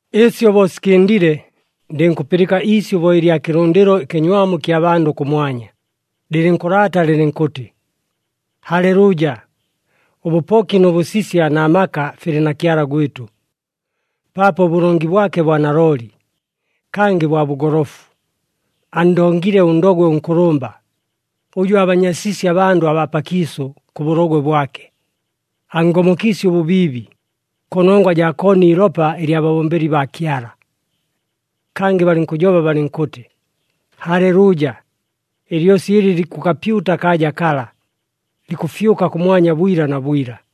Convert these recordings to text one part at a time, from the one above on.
Ɨsyo bo sikɨndile, ndɨnkʉpɨlɨka iisyʉ bo ɨlya kɨlʉndɨlo ɨkɨnywamu ɨkya bandʉ kʉmwanya, lɨlɨnkʉlaata lɨlɨnkʉtɨ, “Halelʉʉja! Ʉbʉpoki nʉ bʉsisya na maka filɨ na Kyala gwɨtʉ, paapo ʉbʉlongi bwake bwa nalooli, kangɨ bwa bʉgolofu. Anndongile ʉndogwe ʉnkʉlʉmba, ʉjʉ aabanyasiisye abandʉ abaa pakiisʉ kʉ bʉlogwe bwake. Anngomokiisye ʉbʉbiibi, kʉnongwa jaa koona iilopa ɨlya babombeli baa Kyala!” Kangɨ balɨnkʉjoba balɨnkʉtɨ, “Halelʉʉja! Ɨlyosi ɨlɨ likʉkapyuta akaaja kala, likʉfyʉka kʉmwanya bwila na bwila!”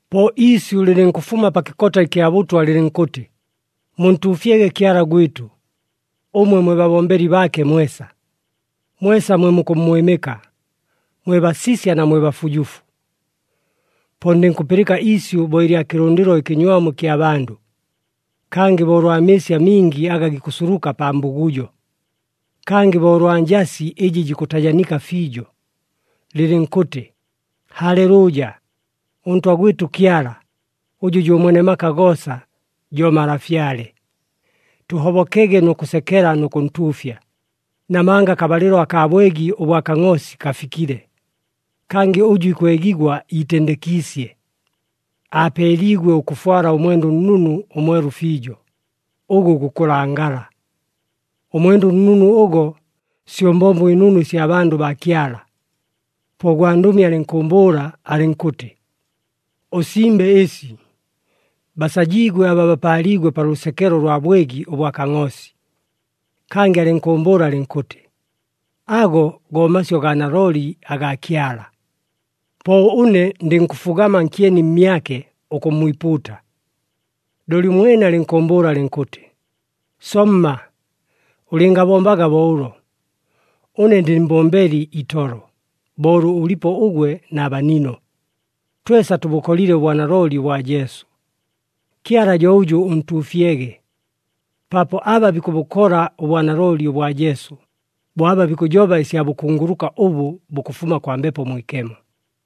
Po iisyʉ lɨlɨnkʉfuma pa kɨkota ɨkya bʉtwa lɨlɨnkʉtɨ, “Muntuufyege Kyala gwɨtʉ, ʉmwe mwe babombeli baake mwesa, mwesa mwe mukʉmmwɨmɨka, mwe basisya na mwe bafujufu.” Po ndɨnkʉpɨlɨka iisyʉ bo ɨlya kɨlʉndɨlo ɨkɨnywamu ɨkya bandʉ, kangɨ bo ʉlwa mɨɨsi amingi aga gikʉsuluka pa mbugujo, kangɨ bo ʉlwa njasi ɨjɨ jikʉtajanika fiijo, lɨlɨnkʉtɨ, “Halelʉʉja! ɄNtwa gwɨtʉ Kyala, ʉjʉ jo Mwene maka goosa, jo Malafyale! Tʉhobokege nʉ kʉsekela nʉ kʉntuufya, namanga akabalɨlo akaa bwegi ʉbwa Kangʼoosi kafikile, kangɨ ʉjʉ ikwegigwa iitendekiisye. Aapeeliigwe ʉkʉfwala ʉmwenda ʉnnunu ʉmwelu fiijo, ʉgʉ gukʉlangala.” Ʉmwenda ʉnnunu ʉgo, syo mbombo ɨnunu ɨsya bandʉ baa Kyala. Po ʉgwandʉmi alɨnkʉʉmbʉʉla alɨnkʉtɨ, “Ʉsimbe ɨsi: Basajiigwe aba bapaaliigwe pa lʉsekelo ʉlwa bwegi ʉbwa Kangʼoosi!” Kangɨ alɨnkʉʉmbʉʉla alɨnkʉtɨ, “Ago go masyʉ gaa nalooli agaa Kyala.” Po ʉne ndɨnkʉfugama nkyeni mmyake ʉkʉmmwipuuta. Looli ʉmwene alɨnkʉʉmbʉʉla alɨnkʉtɨ, “Somma! Ʉlɨngabombaga bo ʉlo! Ʉne ndɨ mbombeli itolo, bo ʉlʉ ʉlipo ʉgwe na banino. Twesa tʉbʉkolile ʉbwanalooli ʉbwa Jesu. Kyala jo ʉjʉ ʉntuufyege! Paapo aba bikʉbʉkola ʉbwanalooli ʉbwa Jesu, bo aba bikʉjoba ɨsya bʉkunguluka ʉbʉ bukʉfuma kwa Mbepo Mwikemo.”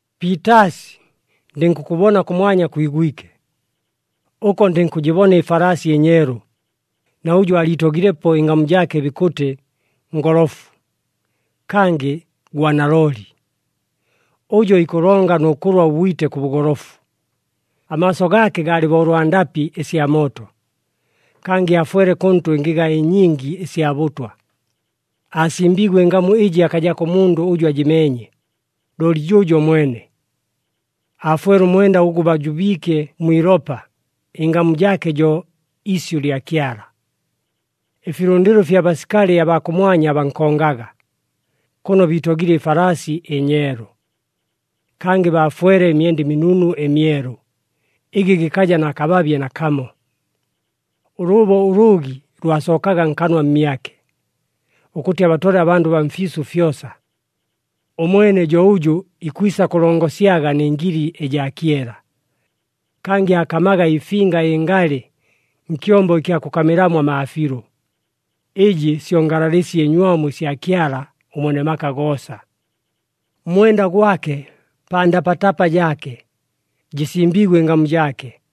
Piitaasi, ndɨnkʉkʉbona kʉmwanya kwigwike. Ʉko ndɨnkʉjɨbona ɨfalaasi ɨnyeelu, na ʉjʉ aaliitogilepo ɨngamu jaake bikʉtɨ, “Ngolofu,” kangɨ, “Gwa nalooli.” Ʉjo ikʉlonga nʉ kʉlwa ʉbwite kʉ bʉgolofu. Amaaso gaake gaalɨ bo ʉlwa ndapɨ ɨsya mooto, kangɨ aafwele kʉntʉ ɨngɨga ɨnyingi ɨsya bʉtwa. Aasimbiigwe ɨngamu ɨjɨ akajako ʉmundʉ ʉjʉ ajɨmeenye, looli jʉʉjo mwene. Aafwele ʉmwenda ʉgʉ baajubiike mwi ilopa. Ɨngamu jaake jo, “Isyʉ lya Kyala.” Ɨfilʉndɨlo ɨfya basikali abaa kʉmwanya bankongaga, kʉno biitogile ɨfalaasi ɨnyeelu. Kangɨ baafwele ɨmyenda ɨminunu ɨmyelu, ɨgɨ gɨkaja na kababye nakamo. Ʉlʉʉbo ʉlʉʉgi lwasookaga nkanwa mmyake, ʉkʉtɨ abatole abandʉ baa mfiisʉ fyosa. “Ʉmwene jo ʉjʉ ikwisa kʉlongosyaga nɨ ngili ɨjaa kyela,” kangɨ aakamaga ɨfinga ɨngalɨ nkyombo ɨkya kʉkamɨlamo amaafiilʉ, ɨjɨ syo ngalalɨsi ɨnywamu ɨsya Kyala ʉMwene maka goosa. Mmwenda gwake pa ndapatapa jaake, jɨsimbiigwe ɨngamu jaake,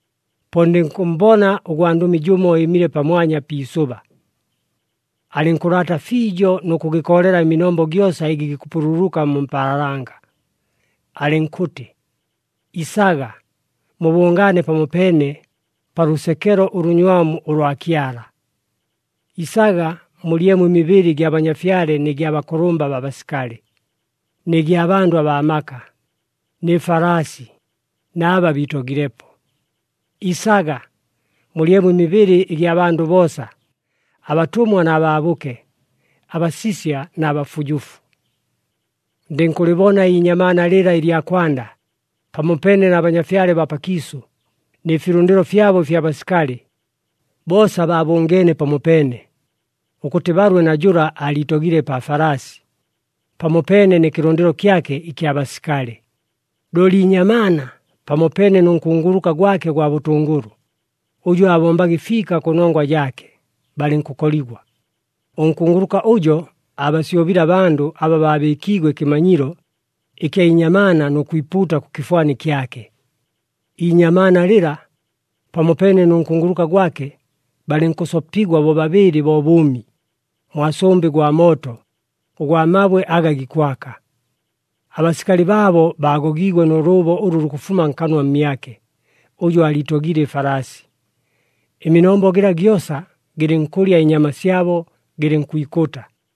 Po ndɨnkʉmmbona ʉgwandʉmi jʉmo ɨɨmile pamwanya pi isʉba. Alɨnkʉlaata fiijo nʉ kʉgɨkoolela ɨminombo gyosa ɨgɨ gikʉpululuka mu mpaalanga, alɨnkʉtɨ, “Isaga! Mubʉngaane pamopeene, pa lʉsekelo ʉlʉnywamu ʉlwa Kyala. Isaga! Mulyemo ɨmibɨlɨ ɨgya banyafyale nɨ gya bakʉlʉmba baa basikali, nɨ gya bandʉ abaa maka, nɨ falaasi na aba biitogilepo. Isaga! Mulyemo ɨmibɨlɨ ɨgya bandʉ boosa, abatʉmwa na baabʉke, abasisya na bafujufu.” Ndɨnkʉlɨbona iinyamaana lɨla ɨlya kwanda, pamopeene na banyafyale baa pakiisʉ nɨ filʉndɨlo fyabo ɨfya basikali. Boosa baabʉngeene pamopeene, ʉkʉtɨ balwe na jʉla aaliitogile pa falaasi, pamopeene nɨ kɨlʉndɨlo kyake ɨkya basikali. Looli iinyamaana, pamopeene nʉ nkunguluka gwake ʉgwa bʉtʉngʉlʉ, ʉjʉ aabombaga ɨfiika kʉnongwa jaake, balɨnkʉkoligwa. Ʉnkunguluka ʉjo aabasyobile abandʉ aba babɨɨkiigwe ɨkɨmanyilo ɨkya inyamaana nʉ kwipuuta kʉ kɨfwani kyake. Iinyamaana lɨla, pamopeene nʉ nkunguluka gwake, balɨnkʉsopigwa bobabɨɨlɨ bo bʉʉmi, mwa sʉmbɨ gwa mooto ʉgwa mabwe aga gikwaka. Abasikali baabo baagogiigwe nʉ lʉʉbo ʉlʉ lukʉfuma nkanwa mmyake ʉjʉ aaliitogile ɨfalaasi. Ɨminombo gɨla gyosa gɨlɨnkʉlya ɨnyama syabo gɨlɨnkwikʉta.